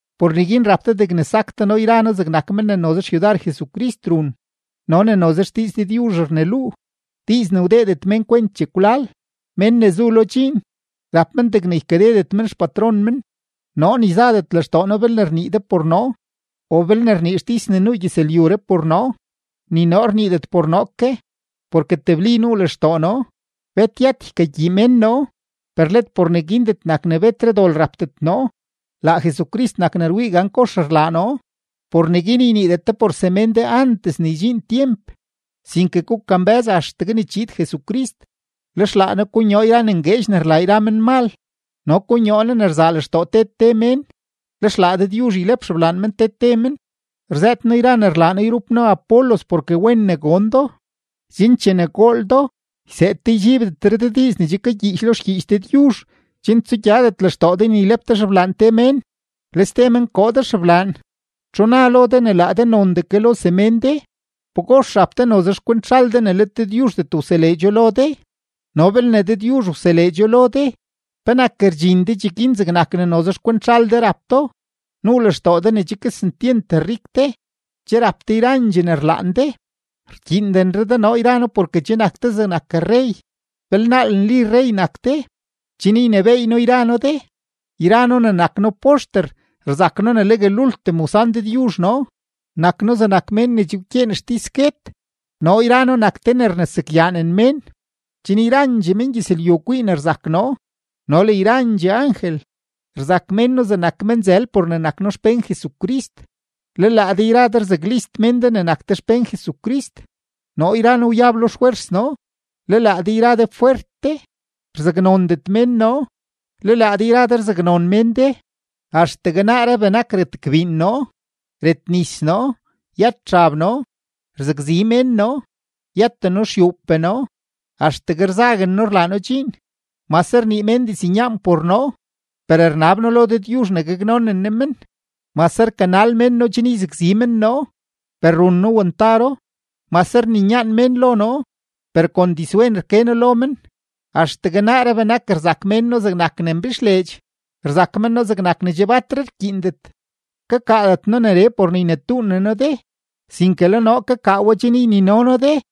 Por neguin rap de degne sak de noo yra noo zegnak men ne noze xyudar Jesucrist run no ne noze xdiiz Dëdyuzh rneluu, diiz ne wdeedet mén kwent chekwlal. Mén ne zu lo dxiin, rap men degne ykadedet men xpatron men. Noo ni zadet lextoo noo belne rnii de por noo o belne rnii xtis ne nuu gyëzlyuree por noo; ni noo rniidet por noo ke, porke tebli nuu lextoo noo, bet yët ykagyii mén noo, per let por neguindet nak ne betre dol rapdet noo; laa Jesucrist nak ne rwii gan kox rlaa noo. Por neguin yniidet de por semén de antes ne ydxiin tyemp, sinke gukambë́z axtegue ne chiid Jesucrist; lex laa Ne konyoo yra ne ngueedx ne rlaa yra menmal no konyoo Ne ne rzaa lextoo te te mén, lex laa Dëdyuzh ylep xeblaan men te te men. Rzëët noo yra ne rlaa noo yrup noo Apolos porke wen ne gon do, chen chene gool do, yseed de ydxiibdetre de diiz ne che kagyiich lo xgyiich Dëdyuzh chen tsugyadet lextoo de ne ylep de xeblaan te mén, le ste men koo de xeblaan. ¿Txu na lo de ne laa de nondee ke lo semén de? ¿Pagox rap de noze xkwent zhal de ne let Dëdyuzhdet wseleedxo lo de? No belne Dëdyuzh wseleedxo lo de, ¿penak rdxin de cheguin zegnak ne noze xkwent zhal de rap do? Nuu lextoo de ne che kesentyent rik de, che rap de yrandxee ne rlaan de, rkyiindenre de noo yra noo porke che nak de zegnak rrey. ¡Belnaal nli rrey nak de, chen ynebééy noo yra noo de! Yra noo ne nak noo poxter, rzak noo legue lultim wsan Dëdyuzh noo, nak noo zegnak mén ne che wkyeen xtis guet. Noo yra noo nak te ne rnesakyaanen mén, chen yrandxee mengyëzlyu kwii ne rzak noo no le yrandxee angel. Rzak mén noo zegnak menzël por ne nak noo xpén Jesucrist, le laa de yra de rzaklist mén de ne nak de xpén Jesucrist. Noo yra noo wyab lo xfwers noo, le laa de yra de fwert de. Rzaknondet mén noo, le laa de yra de rzaknon mén de. Axtegue naaree benak retgbiin noo, retnis noo, yët xab noo; rzakzi mén noo, yëten noo xyuupee noo, axtegue rzaguen noo rlaa noo dxiin. Mase rnii mén diznyaan por noo, per rnab noo lo Dëdyuzh ne gaknonen Ne men. Mase rkanal mén noo chen yzakzi men noo, per run noo wantaro. Mase rninyaan mén lo noo, per kon dizwen rke noo lo men. Axtegue naaree benak rzak mén noo zegnak ne mbixleedx, rzak men noo zegnak ne che batre rkyiindet. Kakaadet noo neree por ne ynetuunen noo de, sinke le noo kakaa we chen ynino noo de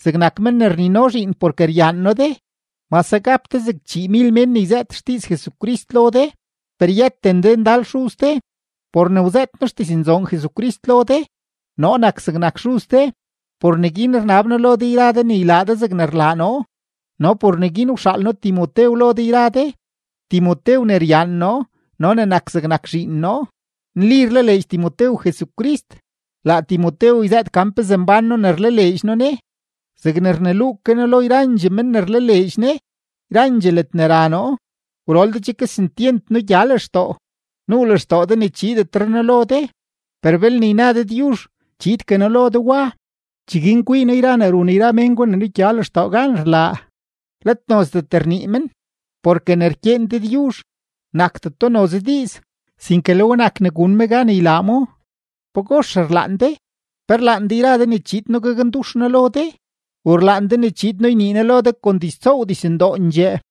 zegnak men ne rnino zhiin porke ryaan noo de. Mase gap de zeg chiimil mén ne yzëët xdiiz Jesucrist lo de, per yëten de ndal xuz de. Por ne wzëët noo xdiznzoon Jesucrist lo de, noo nak zegnak xuz de. Por neguin rnab noo lo de yra de ne ylaa de zegne rlaa noo. No por neguin wxaal noo Timotew lo de yra de, Timotew ne ryaan noo no ne nak zegnak zhiin noo; nli rlaleedx Timotew Jesucrist. Laa Timotew yzëët gan pezee mbán noo ne rlaleedx noo Ne, zegne rneluu ke noo lo yrandxee men ne rlaleedx Ne yrandxee ledne ra noo. Gwrol de che kesentyent nugya lextoo, nuu lextoo de ne chiidetre noo lo de. Per belne yna Dëdyuzh, chiidgue noo lo de wa. Cheguin kwii noo yra ne run yra men gwa ne nugya lextoo gan rlaa, let nozdet rnii men. Porke ne rkyeen Dëdyuzh, nakdeto noze diiz, sinke le we nak ne gun me gan ylaa mo. ¿Pagox rlaan de? ¿Pe rlaan de yra de ne chiid noo gakndux noo lo de, u rlaan de ne chiid noo ynii noo lo de kon diztsoow dizndoondxee?